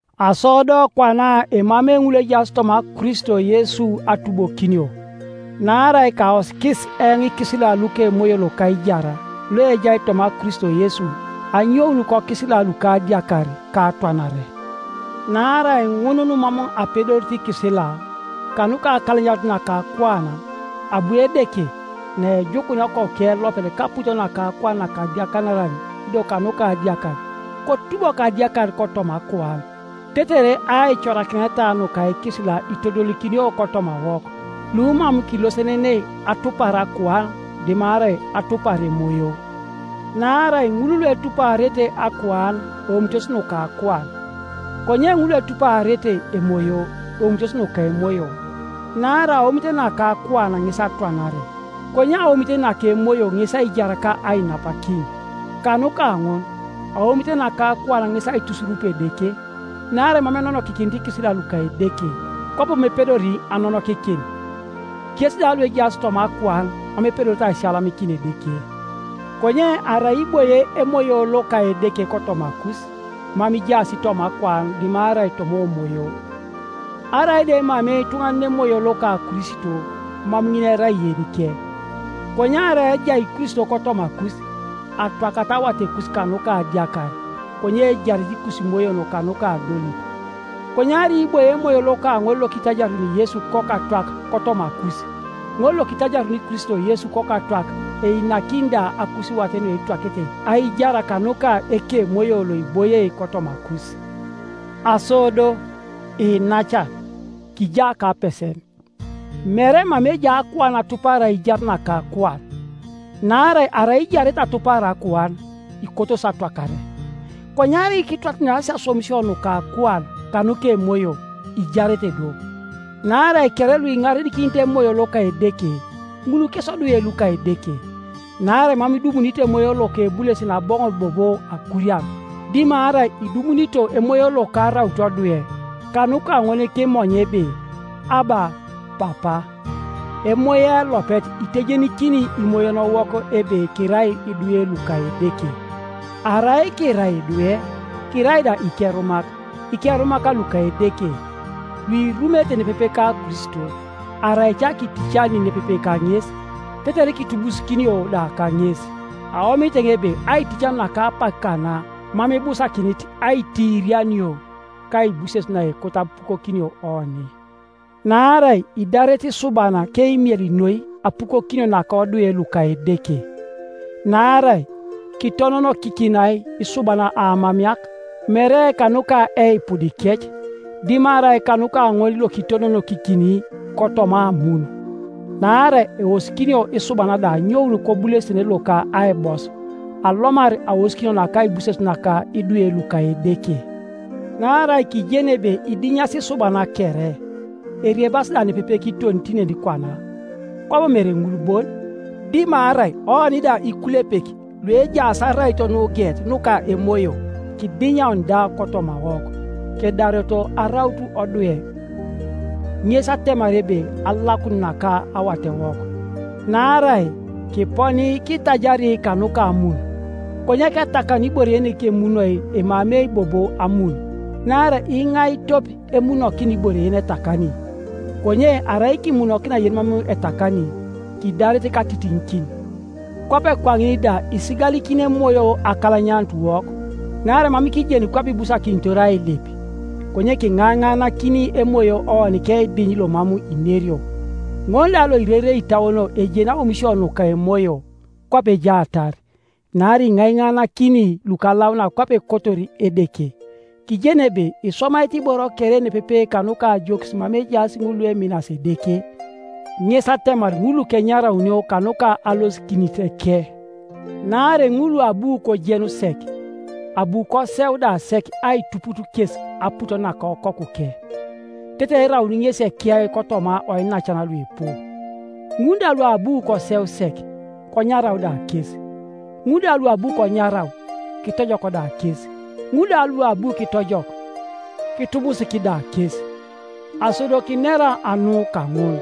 Aso do kwana emamei ŋul luejaas toma Kristo Yesu atubokinio. Naarai kaosikis eoŋ ikisila luka Emoyo loka aijar loejai toma Kristo Yesu anyoun kokisila luka adiakar ka atwanare. Naarai ŋun numam apedorito ikisila, kanuka akalanyanut naka akuan, abu Edeke, naejukunia Okokuke elopet kaput naka akuan nakadiakaran ido kanuka adiakar, kotubok adiakar kotoma akuan, tetere aicorakineta nuka ikisila itodolikinio kotomawok, lumam kilosenenei atupar akuan dimarai atupar Emoyo. Naarai ŋul luetuparete akuan eomitos nuka akuan, konye ŋul luetuparete Emoyo, eomitos nuka Emoyo. Naarai aomit naka akuan ŋes atwanare, konye aomit naka Emoyo ŋes aijar ka ainapakin. Kanuka ŋun aomit naka akuan ŋes aitusurup Edeke; naarai mam enonokikinit ikisila luka Edeke, kwabo mam epedori anonokikin; kes da luejaas toma akuan mam epedorete aisiyalamikin Edeke. Konye arai iboie Emoyo loka Edeke kotomakus, mam ijaas toma akuan dimarai toma Omoyo. Arai da emamei ituŋanan Emoyo loka Kristo, mam ŋin erai yenike. Konye arai ejai Kristo kotomakus, atwakata awatekus kanuka adiakar, konye ejarete ikusimoyon kanuka adolit. Konye arai iboie Emoyo loka ŋol lokitajaruni Yesu kokatwak kotomakus, ŋol lokitajaruni Kristo Yesu kokatwak einakini da akusiwat nuetwakete aijar kanuka Ekemoyo loiboie kotomakus. Aso do, iinacan, kija kapesen, mere mama ejai akuan atupar aijar naka akuan, naarai arai ijarete atupar akuan, ikotosi atwakare, konye arai kitwataniasi aswamisio nuka akuan kanuka Emoyo, ijarete do. Naarai kere luiŋarenikinit Emoyo loka Edeke, ŋul kes odwe luka Edeke. Naarai mam idumunito emoyo loka ebulesene aboŋor bobo akurian, dimarai idumunito emoyo loka araun odwe. Kanuka ŋol kimonya ebe, “Abba! Papa!” Emoyo elopet itejenikini imoyonowok ebe kirai idwe luka Edeke, arai kirai idwe, kirai da ikerumak, ikerumak luka Edeke, luirumete nepepe ka Kristo, arai ca kiiticani nepepe kaŋes, tetere kitubusikinio da kaŋes. Aomit eoŋ ebe aiticanio naka apak kana mam ibusakinit aitiirianio kaibuses naekoto apukokinio oni. Naarai idarete isuban keimiel noi apukokinio naka odwe luka Edeke; naarai kitononokikinai isuban aamameak, mere kanuka eipudikec, dimarai kanuka ŋol lokitononokikini kotoma amun; naarai eosikinio isuban da anyoun kobulesene loka aibos, alomar aosikinio naka aibuses naka idwe luka Edeke. Naarai kijeni ebe idinyasi isuban kere, eriebasi da nepepe kiton tinenikwana; kwabo mere ŋul bon, dimarai oni da ikulepek luejaas araito nugeet nuka Emoyo, kidinya oni da kotomawok, kedareto araut odwe, ŋes atemar ebe alakun naka awatewok Naarai kiponi kitajari kanuka amun. Konye ketakanu ibore yenikemunoi emamei bobo amun. Naarai iŋai tope emunokina ibore yenetakani? Konye arai kimunokina yenimam etakani, kidaret katitiŋikin. Kwape kwaŋin da isigalikini Emoyo akalanyanutuwok; naarai mam kijeni kwape ibusakinitor ailip, konye kinainaanakin Emoyo oni keidiny lomam inerio. Ŋol da loirerei itauon ejeni aomisio nuka Emoyo, kwape ejaatar, naarai iŋaiŋaaŋakini lukalaunak kwape ekotor Edeke. Kijeni ebe iswamaete iboro kere nepepe kanuka ajokis mama ejaas ŋul lueminasi Edeke, ŋes atemar ŋul lukenyaraunio kanuka alosikiniteke. Naarai ŋul luabu kojenu sek, abu koseu da sek aituput kes aput naka Okokuke, tetere erauni ŋesi ekiyai kotoma oinacan luipu. Ŋul da luabu koseu sek, konyarau da kes; ŋul da luabu konyarau, kitojok da kes; ŋul da luabu kitojok, kitubusik da kes. Aso do kinera anu kaŋun?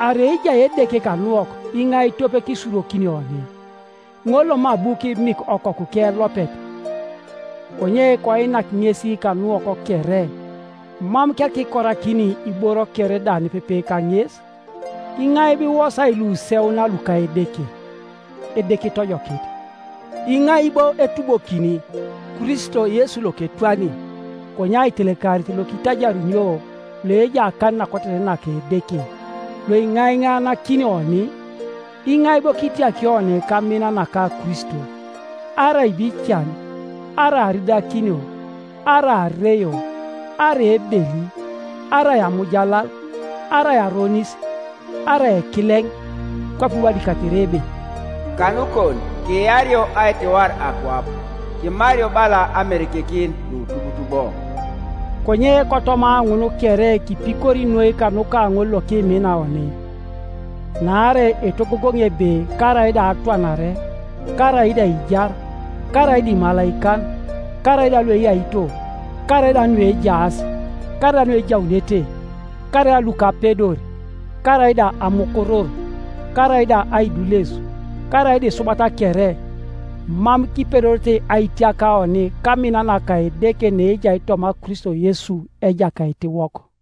Arai ejai Edeke kanuwok iŋai tope kisurokini oni? Ŋol lomam abu kimik Okokuke elopet, konye koinak ŋes kanuwok kere, mam kereka kikorakini iboro kere da nepepe kaŋes? Iŋai bo iwosai luseuna luka Edeke? Edeke itojokit; iŋai bo etubokini? Kristo Yesu loketwani, konye aitelekarit lokitajarunio, loejai akan nakoteten naka Edeke, loiŋaiŋaanakini oni. Iŋai bo kitiaki oni kamin naka Kristo? Arai bo ican, arai aridakinio, arai areio, arai ebeli, arai amujalal, arai aronis, arai ekileŋ? Kwape iwadikatere ebe, “Kanukon kiario aitiwar akwap, Kimario bala amerekekin nutubutubo.” Konye kotoma ŋun kere kipikori noi kanuka ŋol lokimina oni. Naarai etogogoŋi ebe karaida atwanare, karaida aijar, karaida imalaikan, karaida lueyaito, karaida nuejaas, karaida nuejaunete, karaida lukapedor, karaida amukurur, karaida aidules, karaida isubat kere, mam kipedorete aitiak oni kamin naka Edeke naejai toma Kristo Yesu Ejakaitiwok.